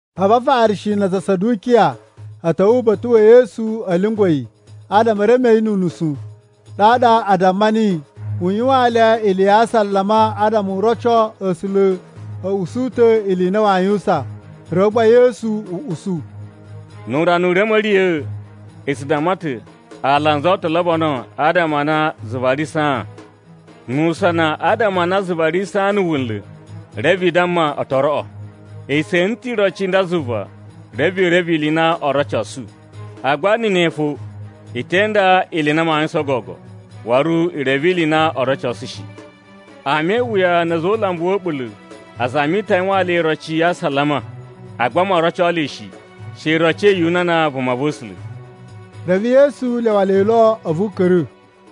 A̱vu Afarishi na aza a Sadukiya a̱ ta̱wa̱ uba̱ta̱ wa̱ Yesu a̱ lyungwa̱ yi adama e reme yi nu unusu, ɗaɗa a damma niyi u yuwaan le ili ya asalama, adama u roco A̱sula̱ a̱ usu ta̱ ili i na waa yuwusan. Reve gba Yesu usu, “Nu urana u ri a̱ ma̱riya̱a̱, i tsu damma ta̱ ‘Alanzu o to lobono adama a na zuva ri saan.’ Nu usana adama a na zuva ri saan na̱ wunla̱, reve i damma, ‘O to roꞌo.’ I tse ene ta̱ iroci i nda zuva, reve i reve ili i na oo rocosu. Agba ne ɗa fo, i te inda ili i na maa yuwusan gogo, waru i reve ili i na oo rocosu shi. Ama e iwuya na̱ a̱za̱ o ulambu wa̱ a̱ɓula̱ a zami ta̱ a yuwaan le iroci ya asalama, agba moo roco le shi, she iroci ya Yunana vumava̱sula̱.” Reve Yesu lyawa le lo a̱vu u ka̱ra̱.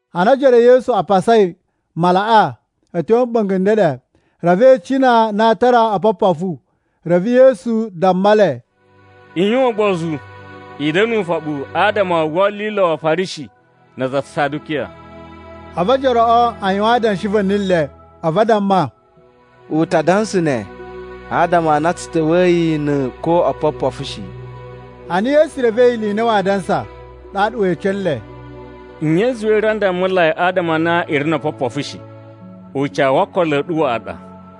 Ana ojoro e Yesu a pasai malaꞌa a̱ tyo a̱ mɓa̱nga̱ n ndeɗe, reve e icina a na aa tara opopofu. Reve Yesu damma le, “I yuwan ugbozu! I da̱na̱ ufoɓu adama o wolilo wa Afarishi na aza a Sadukiya.” A̱vu ojoroꞌo a yuwan adanshi va̱ni le, a̱vu a damma, “U ta dansa ne adama a na tsu ta̱wa̱yi na̱ ko oopopofu shi.” Ana Yesu revei ili i na aa dansa, ɗaɗa we ece nle, “Nye i zuwai i ri a ndammulai adama a na i ri no opopofu shi? Ucawu wo okolo a̱ ɗu waꞌa ɗa.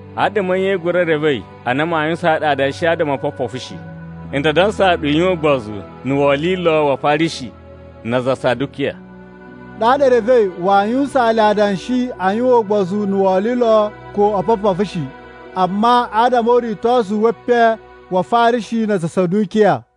Adama a̱ nye i gura revei a na maa yuwusaan ɗu adanshi adama o opopofu shi? N ta dansaa ɗu i yuwan ugbozu na̱ wolilo wa Afarishi na aza a Sadukiya.” Ɗaɗa e revei waa yuwusaan le adanshi a̱ yuwan ugbozu na̱ wolilo ko opopofu shi, amma adama o uritosu we epen wa Afarishi na aza a Sadukiya.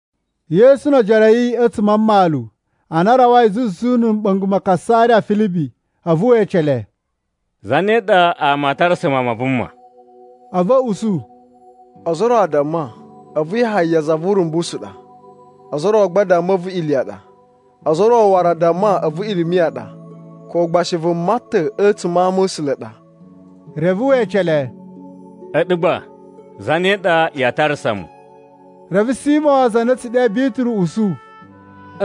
Yesu no ojoro a̱ yi a̱tsuma̱ a mmalu, ana a rawai zuzu na̱ mɓa̱nga̱ ma Kasariya Filibi, a̱vu we ece le, “Zane ɗa ama a tarasa Mawun ma Vuma?” A̱vu a̱ usu, “Ozo o ro a damma, a̱vu Yahaya za vu Urumbusu ɗa, ozo o ro gba a damma a̱vu Iliya ɗa, ozo o ro waru a damma a̱vu Irimiya ɗa, ko gba shi vuma ta̱ a̱tsuma̱ a ama̱sula̱ a ɗa.” Reve we ece le, “A̱ɗu gba, zane ɗa yaa tarasa mu?” Reve Simo za na a̱ tsu ɗe Bituru usu,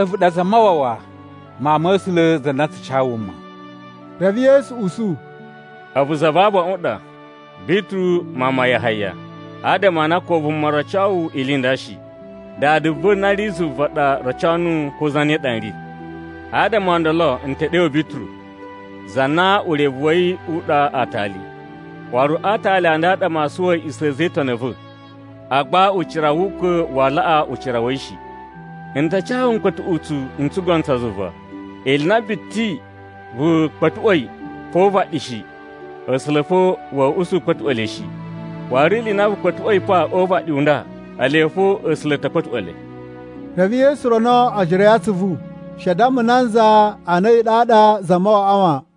“A̱vu ɗa Zamawawa, Mawun ma̱ A̱sula̱ za na tsu ca wuma.” Reve Yesu usu, “A̱vu za va abaꞌun ɗa, Bituru mawun ma Yahaya, adama a na ko vuma roco wu ili i nda shi. Dada va̱ na ri zuva ɗa roco nuwu ko zane ɗa n ri. Adama o ndolo n ta̱ ɗe wu Bituru, za na urevu wa̱ yi u ɗa ‘Aatali.’ Waru a aatali a nda a ɗa maa suwa a̱a̱ꞌisa̱ a̱ a̱za̱ e Itoni a̱ va̱, agba ucira wu ukwa̱ waa laꞌa ucira wa̱ yi shi. N ta ca wu mkpa̱tuꞌutsu n tsugono tsa zuva. Ili i na biti vu kpa̱tuꞌwa̱i pa o uvaɗi shi, A̱sula̱ fo wa̱a̱ usu u kpa̱tuꞌwa̱ le shi. Waru ili i na vu kpa̱tuꞌwa̱i pa o uvaɗi u nda, ele fo A̱sula̱ a̱ ta̱ kpa̱tuꞌwa̱ le.” Reve Yesu rono ojoro a̱ yi atsuvu she a damma nanza a na a̱yi ɗaɗa Zamawawaꞌa wan.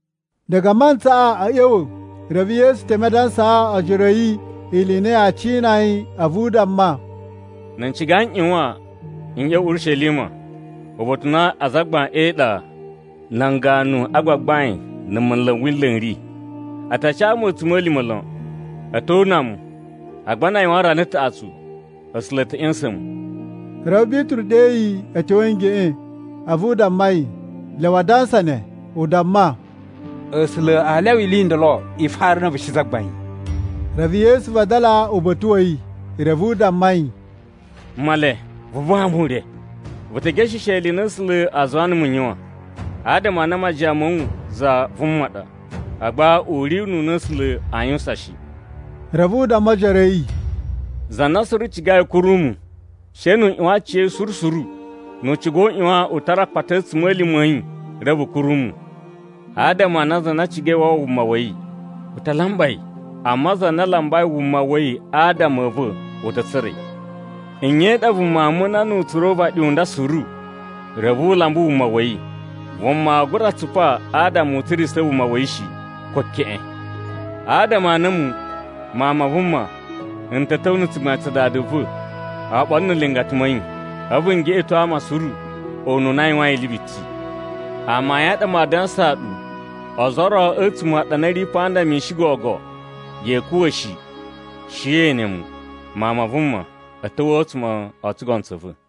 Diga a mantsaꞌa a̱ ꞌya̱wa̱, reve Yesu teme a dansaa ojoro a̱ yi ili i na yaa cina yi. A̱vu u damma, “Na̱ n ciga na̱ n ꞌyuwan n ꞌya̱wa̱ Urishelima uba̱ta̱ u na azagbain e iɗa, nan ganu a gbagbain na̱ munlu n Wila̱ n ri. A ta ca mu a̱tsuma̱lima̱ lon. A̱ to una mu, agba na a yuwan rana taꞌatsu, A̱sula̱ a̱ ta̱ ꞌya̱sa̱n mu.” Reve Bituru ɗe yi a̱ tyo a̱ ngeꞌen, a̱vu u damma yi u lyawa a dansa ne. U damma, “A̱sula̱ aa lyawa ili i ndolo i fara na̱ a̱vu shi, Zagbain!” Reve Yesu vadala uba̱ta̱ wa̱ yi reve u damma yi, “Male, vu buwa mu ure! Vu ta̱ gesheshe ili i na A̱sula̱ a zuwaa numu n yuwan, adama a na majiyan ma̱ wu za vuma ɗa, agba u ri ununa A̱sula̱ aa yuwusan shi.” Reve u damma ojoro a̱ yi, “Za na suru cigai u kuru mu, she nu u ꞌyuwan aciya̱yi suru suru. Nu u ciga u ꞌyuwan u tara akpata a̱ a̱tsuma̱lima̱ a̱ yi reve u kuru mu. Adama a na za na cigai u wawa wuma wa̱ yi, u ta lamba yi, amma za na lambai wuma wa̱ yi adama a̱ va̱, u ta̱ tsura̱ yi. Nye i ɗa vuma aa muna nu u tsura̱ uvaɗi u nda suru, reve u lamba wuma wa̱ yi? Vuma aa gura tsupa adama u tsurisa̱ wuma wa̱ yi shi, ko keꞌen. Adama a na a̱mu, Mawun ma Vuma, n ta̱ ta̱wa̱ na̱ tsugbain tsa Dada va̱ oɓolo na̱ nlingata ma̱ yi, a̱vu n geꞌeto ama suru ununa a yuwain ili biti. Amayun a ɗa maa dansaa ɗu, ozo o ro a̱tsuma̱ a̱ ɗu a na i ri pa nda mishin gogo, ya̱a̱ kuwa̱ shi, she na̱ ye ene mu, Mawun ma Vuma, a̱ ta̱wa̱ a̱tsuma̱ o tsugono tsa̱ va̱.”